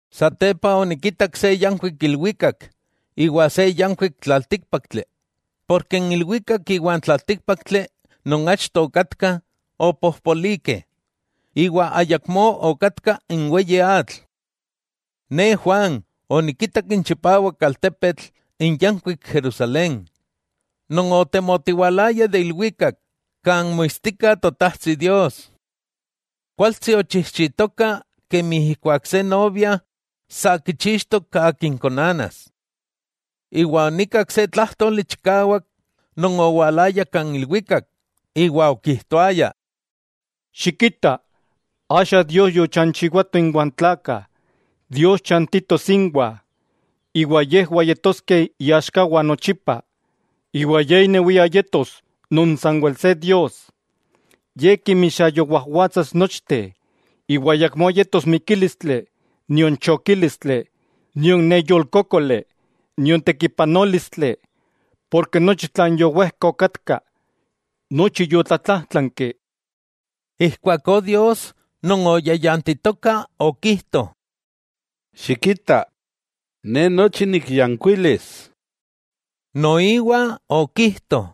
Satepa onikitak se yankuik ilwikak iwa se yankuik tlaltíkpaktli, porke n ilwikak iwa n tlaltíkpaktli non achto okatkah, opojpolikeh, iwa ayakmó okatka n weyi atl. Ne Juan onikitak n chipawak altepetl, n yankuik Jerusalén, non otemotiwalaya de ilwikak, kan moitstika Totajtsi Dios. Kualtsi ochijchitoka kemi ijkuak se novia sa kichixtok akin konanas. Iwa onikak se tlájtoli chikawak non owalaya ik ilwikak, iwa okijtoaya: —Xikita, axa Dios yochanchiwato iwa n tlakah. Dios chantitos inwah; iwa yejwah yetoskeh iaxkawah nochipa, iwa Ye inewia yetos non sanwel se Dios. Ye kinmixayowajwatsas nochteh, iwa ayakmó yetos mikílistli, nion chokílistli, nion neyolkókoli, nion tekipanólistli, porke nochi tlan yowejka okatka, nochi yotlatlajtlanki. Ijkuakó Dios non oyayantitoka okijto: —Xikita, ne nochi nikyankuilis. Noiwa okijto: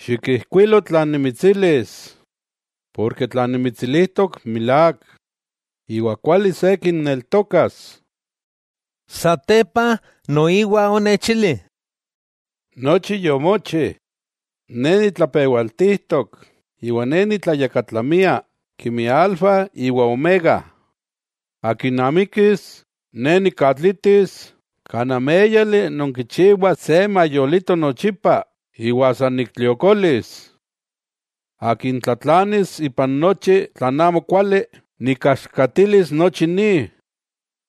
—Xikijkuilo tlan nimitsilis, porke tlan nimitsilijtok milák iwa kuali se kinneltokas. Satepa noiwa onechili: —Nochi yomochi. Ne nitlapewaltijtok iwa Ne nitlayakatlamia, kemi Alfa iwa Omega. Akin amikis, ne nikatlitis kan améyali non kichiwa se mayolito nochipa, iwa san niktliokolis. Akin tlatlanis ipan nochi tlan amokuali, nikaxkatilis nochi ni,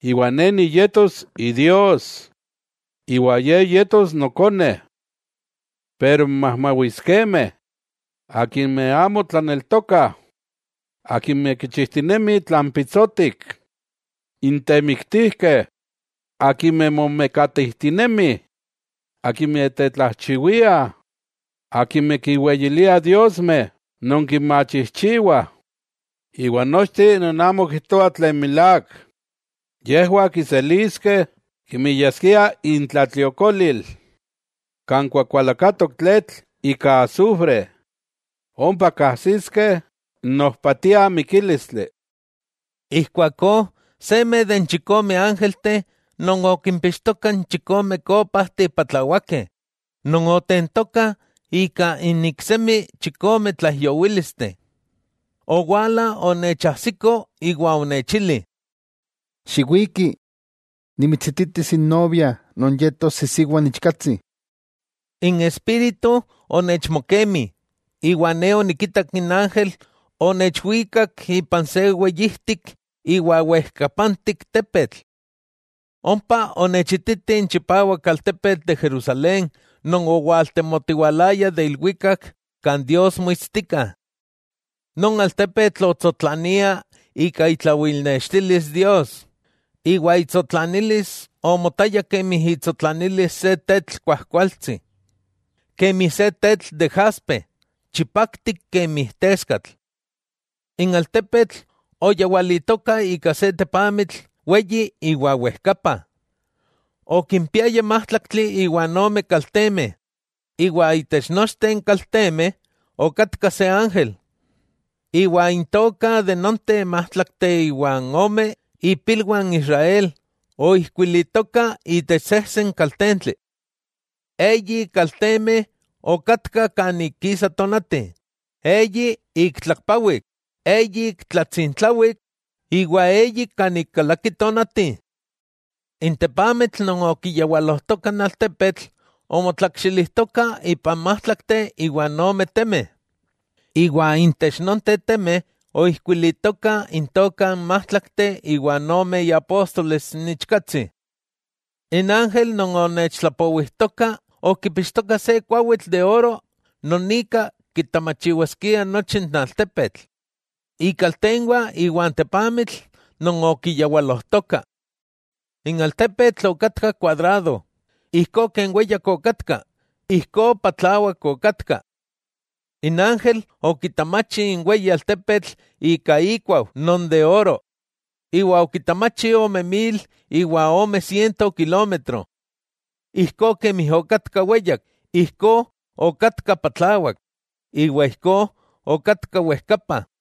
iwa Ne niyetos Idios, iwa ye yetos nokone. Pero n majmawiskemeh, akimeh amo tlaneltokah, akimeh kichijtinemih tlan pitsotik, n temiktijkeh, akimeh momekatijtinemih, akimeh tetlajchiwiah, akimeh kinweyiliah diosmeh non kinmachijchiwah, iwa nochteh non amo kijtoah tlan milák, yejwah kiseliskeh kemi yaskia intlatliokolil, kan kuakualakatok tletl ika asufre. Ompa kajsiskeh n ojpatia mikílistli. Ijkuakó seme de n chikome ángelteh non okimpixtokah n chikome kópajteh patlawakeh non otentokah ika n iksemi chikome tlaijyowílisteh, owala onechajsiko iwa onechili: —Xiwiki, nimitsititis n novia, non yetos isiwa n Ichkatsi. N Espíritu onechmokemi, iwa ne onikitak n ángel onechwikak ipan se weyijtik iwa wejkapantik tepetl. Ompa onechititi n chipawak altepetl de Jerusalén non owaltemotiwalaya de ilwikak kan Dios moitstika. Non altepetl otsotlania ika itlawilnextilis Dios, iwa itsotlanilis omotaya kemi itsotlanilis se tetl kuajkualtsi, kemi se tetl de jaspe, chipaktik kemi teskatl. N altepetl oyawalitoka ika se tepamitl weyi iwa wejkapa. Okimpiaya májtlaktli iwa ome kaltemeh, iwa itech nochteh n kaltemeh okatka se ángel. Iwa intokah nonteh májtlakteh iwa ome ipilwah n Israel oijkuilitokah intech sejsen kaltentli. Eyi kaltemeh okatkah kan ik kisa tonati, eyi ik tlakpawik, eyi ik tlatsintlawik, iwa eyi kan ik kalaki tonati. N tepamitl non okiyawalojtoka n altepetl omotlakxilijtoka ipan májtlakteh iwa ome temeh, iwa intech nonteh temeh oijkuilitokah intokah n májtlakteh iwa ome iapóstoles n Ichkatsi. N ángel non onechtlapowijtoka okipixtoka se kuawitl de oro non ika kitamachiwaskia nochi n altepetl, ikaltenwah iwa n tepamitl non okiyawalojtoka. N altepetl okatka kuadrado, ijkó ken weyak okatka, ijkó patlawak okatka. N ángel okitamachi n weyi altepetl ika ikuau non de oro, iwa okitamachi ome mil iwa ome siento kilómetro. Ijkó kemi okatka weyak, ijkó okatka patlawak, iwa ijkó okatka wejkapa.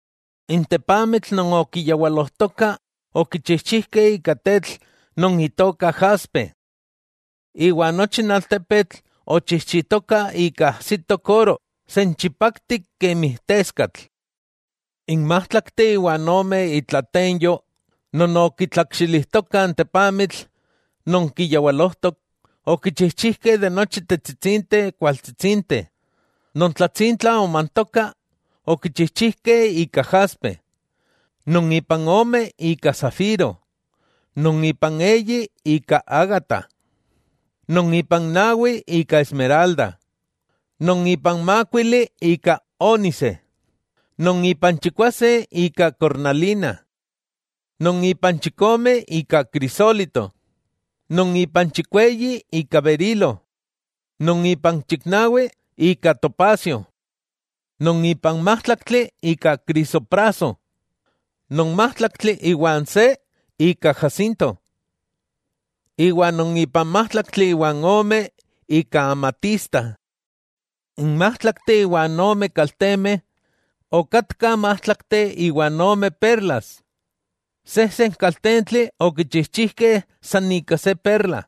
N tepamitl non okiyawalojtoka okichijchijkeh ika tetl non itoka jaspe. Iwa nochi n altepetl ochijchitoka ika ajsitok oro, senchipaktik kemi teskatl. N májtlakteh iwa ome itlatenyo non okitlakxilijtokah n tepamitl non kiyawalojtok, okichijchijkeh ika nochi tetsitsinteh kualtsitsinteh. Non tlatsintla omantoka, okichijchijkeh ika jaspe; non ipan ome ika safiro; non ipan eyi ika ágata; non ipan nawi ika esmeralda; non ipan mákuili ika ónise; non ipan chikwase ika kornalina; non ipan chikome ika krisólito; non ipan chikweyi ika berilo; non ipan chiknawi ika topasio; non ipan májtlaktli ika krisopraso; non májtlaktli iwa n se ika jacinto; iwa non ipan májtlaktli iwa ome ika amatista. N májtlakteh iwa ome kaltemeh okatkah májtlakteh iwa ome perlas, sejsen kaltentli okichijchijkeh san ika se perla.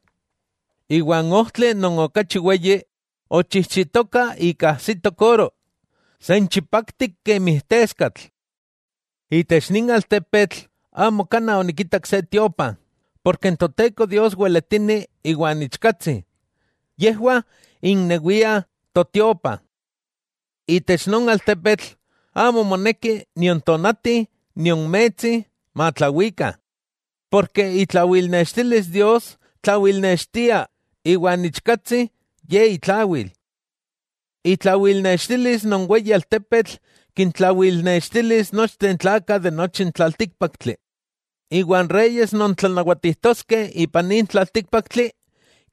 Iwa n ojtli non okachi weyi, ochijchitoka ika ajsitok oro, senchipaktik kemi teskatl. Itech nin altepetl amo kanaj onikitak se tiopa, porke n Toteko Dios weletini iwa n Ichkatsi, yejwah innewiah totiopa. Itech non altepetl amo moneki nion tonati nion metsi matlawikah, ken itlawilnextilis Dios tlawilnextia, iwa n Ichkatsi, Ye itlawil. Itlawilnextilis non weyi altepetl kintlawilnextilis nochteh n tlakah de nochi n tlaltíkpaktli, iwa n reyes non tlanawatijtoskeh ipan nin tlaltíkpaktli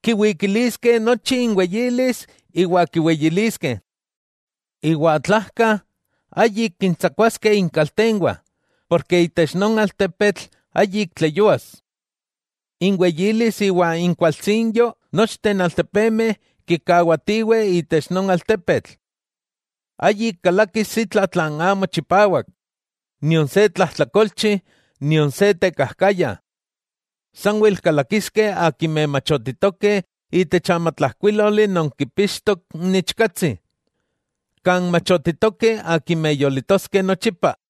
kiwikiliskeh nochi inweyilis iwa kiweyiliskeh. Iwa tlajka, ayik kintsakuaskeh ikaltenwah, ken itech non altepetl ayik tleyúas. Inweyilis iwa inkualtsinyo nochteh altepemeh kikawatiweh itech non altepetl. Ayik kalakis itla tlan amo chipawak, nion se tlajtlakolchi nion se tekajkaya. Sanwel kalakiskeh akimeh machotitokeh itech n amatlajkuíloli non kipixtok n Ichkatsi, kan machotitokeh akimeh yolitoskeh nochipa.